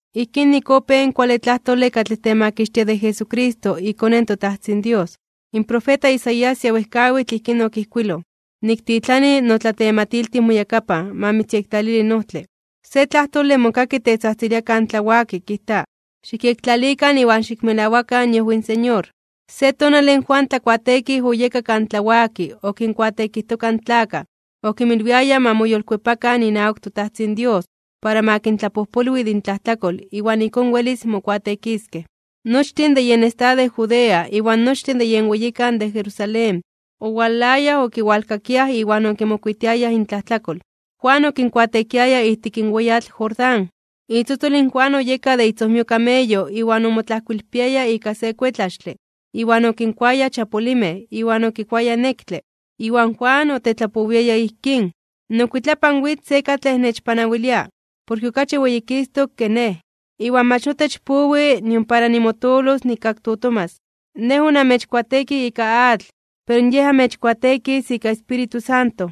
Ijkín nik opéj in kuale tlajtole katlej temakixtia de Jesucristo iKone in toTajtzin Dios. In profeta Isaías ya wejkawitl ijkín okijkuiloj: Niktitlani notlatematiltij moyakapan, ma mitzyektlalili in ojtle. Se tlajtole mokaki tetzajtzilia kan tlawaki kijta: “Xikyektlalikan iwan xikmelawakan iojwi in Señor.” Se tonale in Juan Tlakuateekij oyeka kan tlawaki okinkuateekijtoka in tlakaj, okinmilwiaya ma moyolkuepakan inawak toTajtzin Dios para ma kintlapojpolwi de intlajtlakol iwan ijkón welis mokuateekiskej. Nochtin de yen estado de Judea, iwan nochtin de yen weyikan de Jerusalén, owalayaj okiwalkakiaj iwan okimokuitiayaj intlajtlakol. Juan okinkuateekiaya ijtik in weyatl Jordán. Itzotzol in Juan oyeka de itzojmio kameyo iwan omotlajkoilpiaya ika se kuetlaxtle, iwan okinkuaya chapulimej (xolinmej) iwan okikuaya nektle. Iwan Juan otetlapowiaya ijkín: ―Nokuitlapan witz se katlej nechpanawilia, porke okachi weyikistok (weyititok) ke nej, iwan mach notech powi nion para nimotoolos nikaktotomas. Nej onamechkuateekij ika atl pero Yej amechkuateekis ika Espíritu Santo.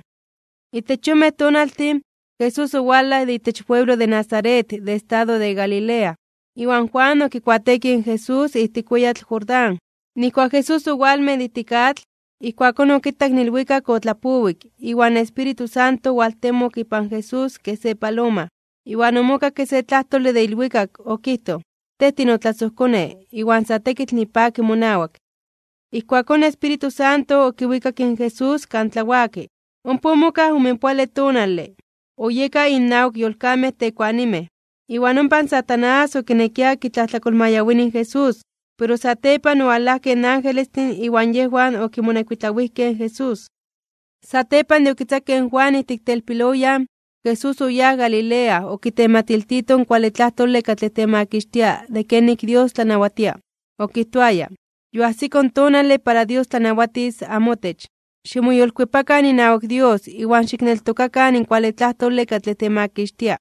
Itech yonmej tonaltin, Jesús owalaj de itech ipueblo Nazaret de estado de Galilea, iwan Juan okikuateekij in Jesús ijtik in weyatl Jordán. Nijkuak Jesús owalmej de ijtik atl, ijkuakón okitak in ilwikak otlapowik iwan in Espíritu Santo owaltemok ipan Jesús kej se paloma. Iwan omokakke se tlajtole de ilwikak. Okijtoj: ―Tej tinotlasojKone, iwan sa tekitl nipaki monawak. Ijkuakón in Espíritu Santo okiwikak in Jesús kan tlawaki. Ompa omokaj omenpoale tonale, oyeka innawak yolkamej tekuanimej. Iwan ompa in Satanás okinekia kitlajtlakolmayawini in Jesús, pero satepan owalajkej in angelestin iwan yejwan okimonekuitlawijkej in Jesús. Satepan de okitzakej in Juan ijtik telpiloyan, Jesús oyáj Galilea okitematiltito in kuale tlajtole katlej temakixtia de kenik in Dios tlanawatia. Okijtoaya: ―Yoajsiko in tonale para Dios tlanawatis amotech. Ximoyolkuepakan inawak Dios iwan xikneltokakan in kuale tlajtole katlej temakixtia.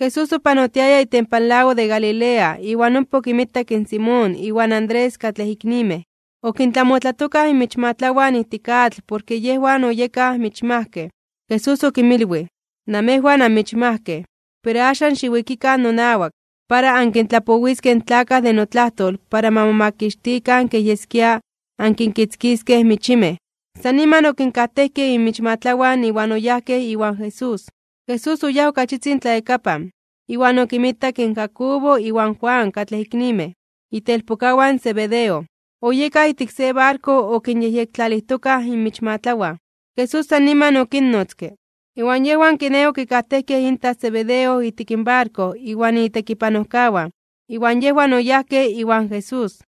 Jesús opanotiaya itempan lago de Galilea iwan ompa okinmitak in Simón iwan Andrés katlej iknimej, okintlamotlatokaj inmichmatlawan ijtik atl porke yejwan oyekaj michmajkej. Jesús okinmilwij: ―Namejwan anmichmajkej. Pero axan xiwikikan nonawak, para ankintlapowiskej in tlakaj de notlajtol para ma momakixtikan kej yeskia ankinkitzkiskej michimej. San niman okinkajtejkej inmichmatlawan iwan oyajkej iwan Jesús. Jesús oyáj ok achitzin tlayakapan, iwan okinmitak in Jacobo iwan Juan katlej iknimej, itelpokawan Zebedeo, oyekaj ijtik se barko okinyejyektlalijtokaj inmichmatlawan. Jesús san niman okinnotzke, iwan yejwan kiné okikajtejkej intaj Zebedeo ijtik barko iwan itekipanojkawan, iwan yejwan oyajkej iwan Jesús.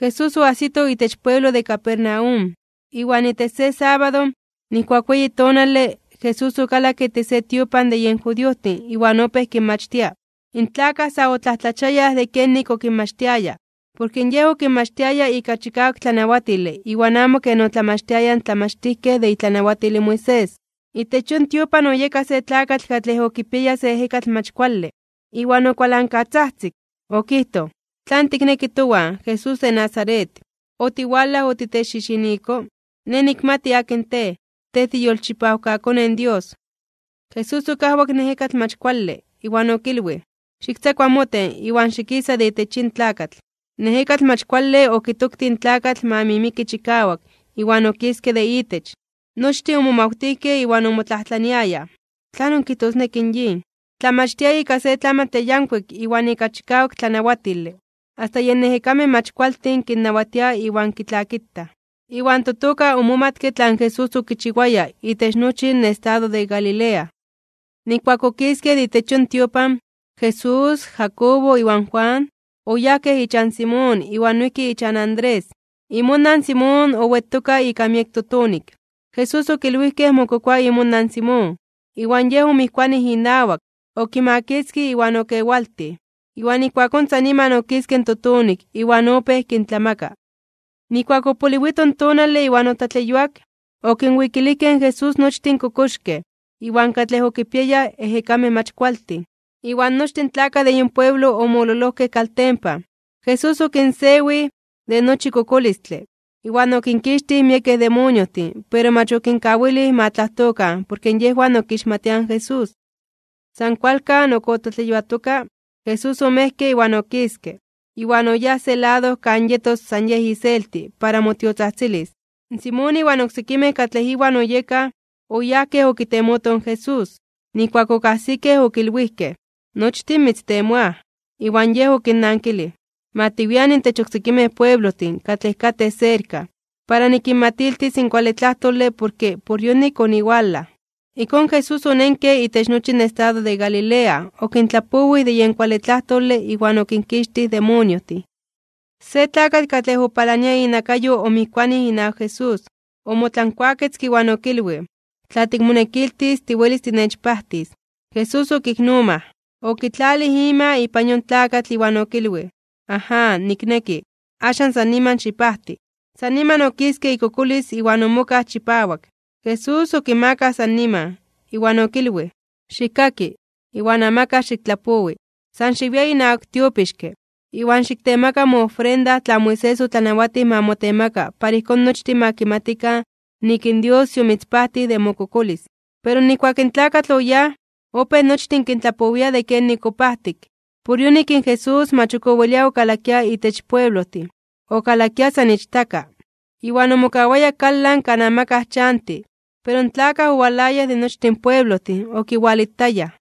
Jesús oajsito itech pueblo de Capernaum, iwan itech se sábado, nijkuak weyi tonale, Jesús okalakke itech se tiopan de yen judiojtin iwan opéj kinmachtia. In tlakaj sa otlajtlachiayaj (omomajmawtiayaj) de kenik okinmachtiaya, porke Yej okinmachtiaya ika chikawak tlanawatile iwan amo ken otlamachtiayaj in tlamachtijkej de itlanawatil in Moisés. Itech yon tiopan oyeka se tlakatl katlej okipiaya se ejekatl mach kuale, iwan okualankatzajtzik. Okijtoj: ―¿Tlan tikneki towan, Jesús de Nazaret? ¿Otiwalaj otechxixiniko? Nej nikmati akin Tej, Tej tiiyolchipawkaKone in Dios. Jesús okajwak in ejekatl mach kuale, iwan okilwij: ―¡Xiktzakua moten, iwan xikisa de itech yin tlakatl! In ejekatl mach kuale okitoktij in tlakatl ma mimiki chikawak, iwan okiske de itech. Nochtin omomawtijkej iwan omotlajtlaniayaj: ―¿Tlanon kijtosneki yin? ¡Tlamachtia ika se tlamantle yankuik iwan ika chikawak tlanawatile! Asta yen ejekamej mach kualtin kinnawatia iwan kitlakitaj. Iwan totoka omomatke tlan Jesús okichiwaya itech nochi in estado de Galilea. Nijkuak okiskej de itech yon tiopan, Jesús, Jacobo iwan Juan, oyajkej ichan Simón iwan noijki ichan Andrés. Imonan Simón owetoka ika miek totonik. Jesús okilwijkej mokokoa imonan Simón. Iwan Yej omijkuanij inawak, okimakitzkij iwan okewaltij. Iwan ijkuakón san niman okiske in totonik iwan opéj kintlamaka. Nijkuak opoliwito in tonale iwan otlatleyuak, okinwikilijkej in Jesús nochtin kokoxkej, iwan katlej okipiayaj ejekamej mach kualtin. Iwan nochtin tlakaj de yon pueblo omololojkej kaltempan. Jesús okinsewij (okinpajtij) de nochi kokolistle, iwan okinkixtij miekej demoniojtin pero mach okinkawilij ma tlajtokan porke yejwan okixmatiaj in Jesús. San kualkan ok otlatleyuatoka, Jesús omejke iwan okiske, iwan oyáj se lado kan yetos san Yej iselti para motiotzajtzilis. Simón iwan oksekimej katlej iwan oyekaj, oyajkej okitemotoj in Jesús. Nijkuak okajsikej okilwijkej: ―Nochtin mitztemoaj. Iwan Yej okinnankilij: ―Ma tiwian intech oksekimej pueblojtin katlej katej serka, para nikinmatiltis in kuale tlajtole porke por yonik oniwalaj. Ijkón Jesús onenke itech nochi in estado de Galilea okintlapowij de yen kuale tlajtole iwan okinkixtij in demoniojtin. Se tlakatl katlej opalania inakayo omijkuanij inawak Jesús, omotlankuaketzke iwan okilwij: ―Tla tikmonekiltis, tiwelis tinechpajtis. Jesús okiknomaj, okitlalij ima ipan yon tlakatl iwan okilwij: ―Aján, nikneki. Axan san niman xipajti. San niman okiske ikokolis iwan omokaj chipawak. Jesús okimakaj san niman, iwan okinajnawatij okilwij: ―Xikkaki, iwan amakaj xiktlapowi, san xiwia inawak in tiopixke, iwan xiktemaka moofrenda tlan Moisés otlanawatij ma motemaka para ijkón nochtin ma kimatikan nik in Dios yomitzpajtij de mokokolis. Pero nijkuak in tlakatl oyáj, opéj nochtin kintlapowia de kenik opajtik. Por yonik in Jesús mach ok owelia okalakia itech pueblojtin, okalakia san ichtaka. Iwan omokawaya kalan kan amakaj chanti, pero in tlakaj owalayaj de nochtin pueblojtin okiwalitayaj.